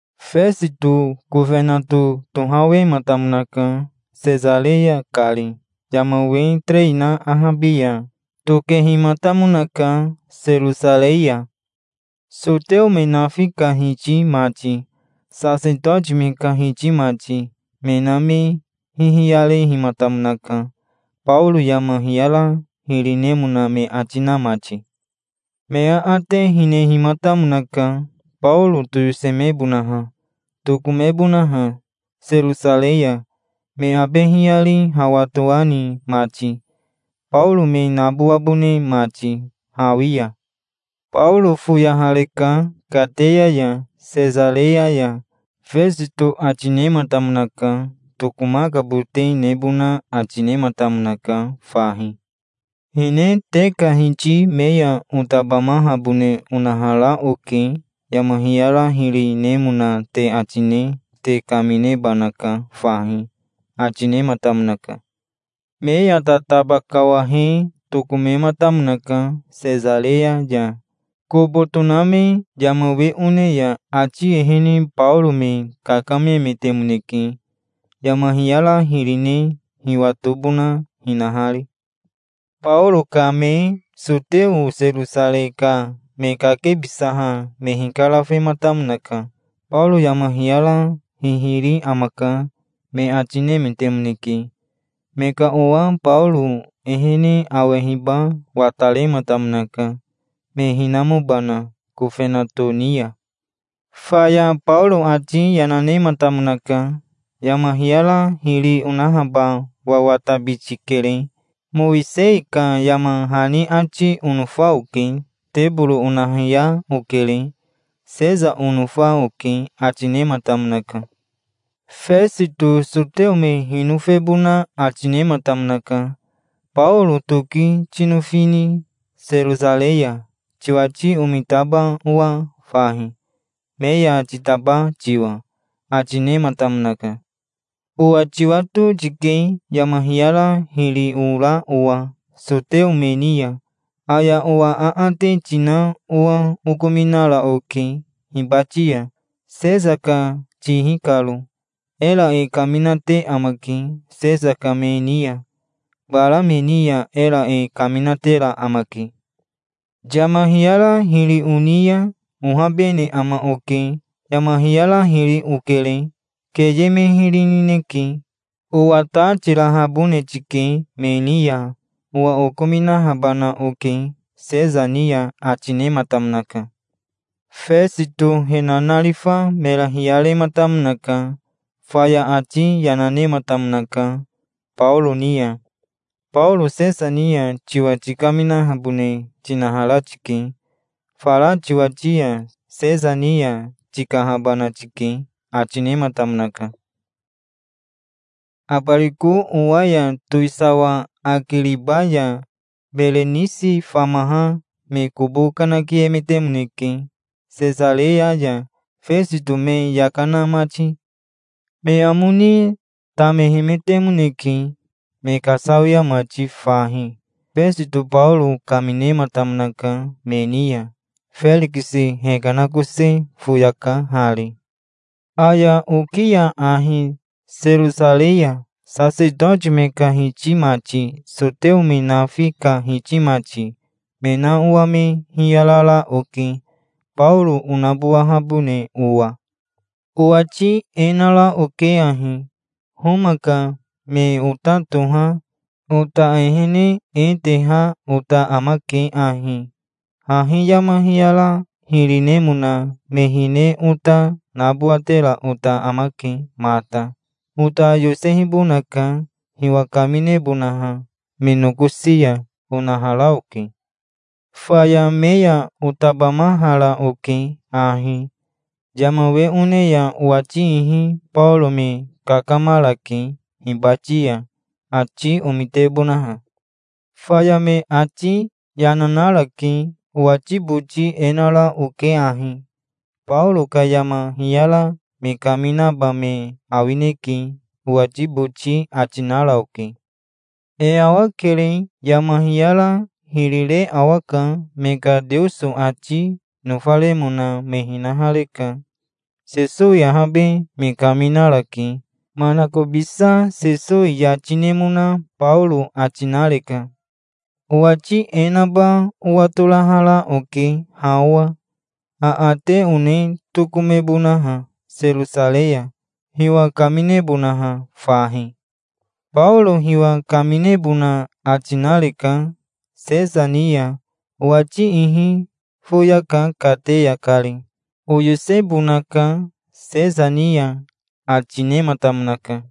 Fesito kofenato tohawematamonaka, Sesareya kari. Yama we terei na ahabi ya tokehimatamonaka Serosarei ya. Soteo me nafi ka hiti mati, sasetoti me ka hiti mati, me na me hihiyarehimatamonaka, Baoro yama hiyara hiri nemona me ati na mati. Me aate hinehimatamonaka, Baoro toyosemebonaha, tokomebonaha Serosarei ya, me abe hiyari hawa toani mati, Baoro me nabowabone mati hawi ya. "Baoro foyahareka kateya ya Sesareya ya", Fesito ati nematamonaka. Tokomakabote nebona ati nematamonaka fahi. "Hine te ka hiti me ya otabamahabone onahara oke. Yama hiyara hiri nemona te ati ne te kaminebanaka fahi", ati nematamonaka. Me ya tataba kawahe tokomematamonaka Sesareya ya. Kobo toname yama we one ya ati ehene Baoro me kakamemetemoneke, yama hiyara hiri ne hiwatobona hinahari. Baoro kame soteo Serosarei ka me kakebisaha me hikarafematamonaka. "Baoro yama hiyara hihiri amaka', me ati nemetemoneke. Me ka owa Baoro ehene awehiba watarematamonaka, me hinamobana kofenato ni ya. Faya Baoro ati yana nematamonaka. "Yama hiyara hiri onahaba wawatabiti kere. Mowisei ka yama hani ati onofa oke. Teboro onahiya okere. Sesa onofa", oke, ati nematamonaka. Fesito soteo me hinofebona ati nematamonaka. "Baoro toki tinofini Serosarei ya, tiwati omitaba owa fahi, me ya titaba tiwa?" ati nematamonaka. "Owa tiwato tike yama hiyara hiri ora owa soteo me ni ya. Aya owa aate tina owa okominara oke hibati ya, Sesa ka tihi karo. Era e kaminate amake Sesa ka me ni ya. Bara me ni ya era e kaminatera amake. Yama hiyara hiri oni ya ohabene ama oke. Yama hiyara hiri okere. Keye me hiri nineke. Owa ta tirahabone tike me ni ya. Owa okominahabana oke Sesa ni ya", ati nematamonaka. Fesito he nanarifa mera hiyarematamonaka. Faya ati yana nematamonaka Baoro ni ya. "Baoro Sesa ni ya tiwa tikaminahabone tinahara tike. Fara tiwati ya Sesa ni ya tikahabana tike", ati nematamonaka. Abariko owa ya towisawa Akiriba ya Berenisi famaha me kobo kanakiemetemoneke Sesareya ya, Fesito me yaka na mati. Me amo ni tamehemetemoneke, me kasawia mati fahi. Fesito Baoro kaminematamonaka me ni ya. "Ferikisi hekanakose foyaka hari. Aya oki ya ahi Serosarei ya sasetoti me ka hiti mati, soteo me nafi ka hiti mati, me na owa me hiyarara oke, Baoro onabowahabone owa. Owati e nara oke ahi. 'Homa ka me ota toha ota ehene e teha ota amake ahi: Hahi yama hiyara hiri nemona me hine ota nabowatera ota amake mata. Ota yosehibonaka hiwa kaminebonaha me nokosi ya', onahara oke. Faya me ya otabamahara oke ahi. Yama we one ya owati ihi Baoro me kakamarake hibati ya, ati omitebonaha. Faya me ati yana narake. Owati boti e nara oke ahi: 'Baoro ka yama hiyara me kaminaba me awineke', owati boti ati nara oke. E awakere. Yama hiyara hiri re awaka. Me ka Teoso ati nofaremona me hinahareka. Sesowi ahabe me kaminarake. Manakobisa Sesowi yati nemona Baoro ati nareka. Owati e naba owatorahara oke ha owa. Aate one tokomebonaha Serosarei ya, hiwa kaminebonaha fahi. Baoro hiwa kaminebona ati nareka Sesa ni ya. Owati ihi foyaka kateya kari. Oyosebonaka Sesa ni ya", ati nematamonaka.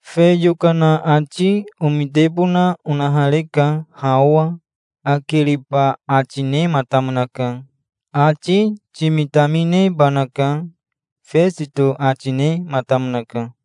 "Fe yokana ati omitebona onahareka ha owa", Akiriba ati nematamonaka. "Ati timitaminebanaka", Fesito ati nematamonaka.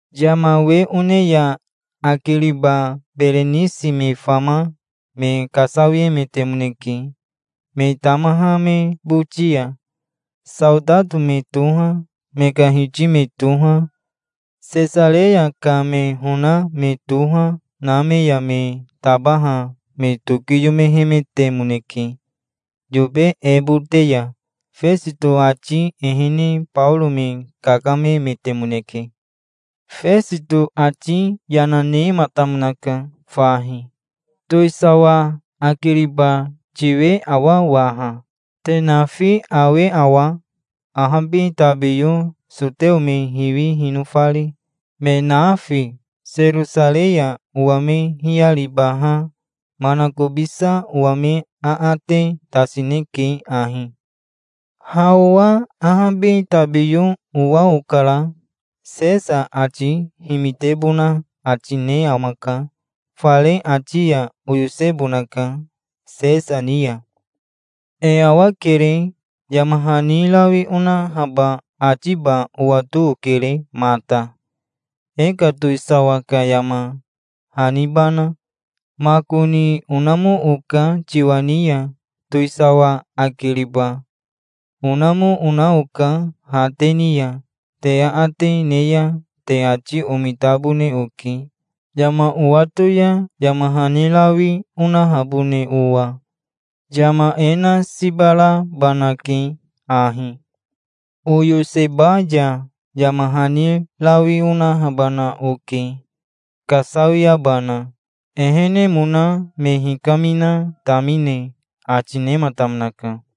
Yama we one ya Akiriba Berenisi me fama me kasawiemetemoneke me tamaha me boti ya. Saotato me toha, me ka hiti me toha, Sesareya ka me hona me toha, na me ya me tabaha me tokiyomehemetemoneke yobe ebote ya. Fesito ati ehene Baoro me kakamemetemoneke. Fesito ati yana nematamonaka fahi. "Towisawa Akiriba tiwe awa waha? Te nafi awe awa, ahabi tabiyo soteo me hiwi hinofari, me nafi? Serosarei ya owa me hiyaribaha manakobisa owa me aate tasineke ahi. Ha owa ahabi tabiyo owa okara. Sesa ati himitebona ati ne amaka. Fare ati ya oyosebonaka Sesa ni ya. E awakere. Yama hani rawi onahaba atiba owato okere mata, e ka towisawa ka yama hanibana. Makoni onamo oka tiwa ni ya towisawa Akiriba. Onamo, ona oka ha te ni ya. Te aate ne ya te ati omitabone oke, yama owato ya yama hani rawi onahabone owa. Yama e na siba rabanake ahi. Oyoseba ya yama hani rawi onahabana oke, kasawiabana, ehenemona me hikamina tamine", ati nematamonaka.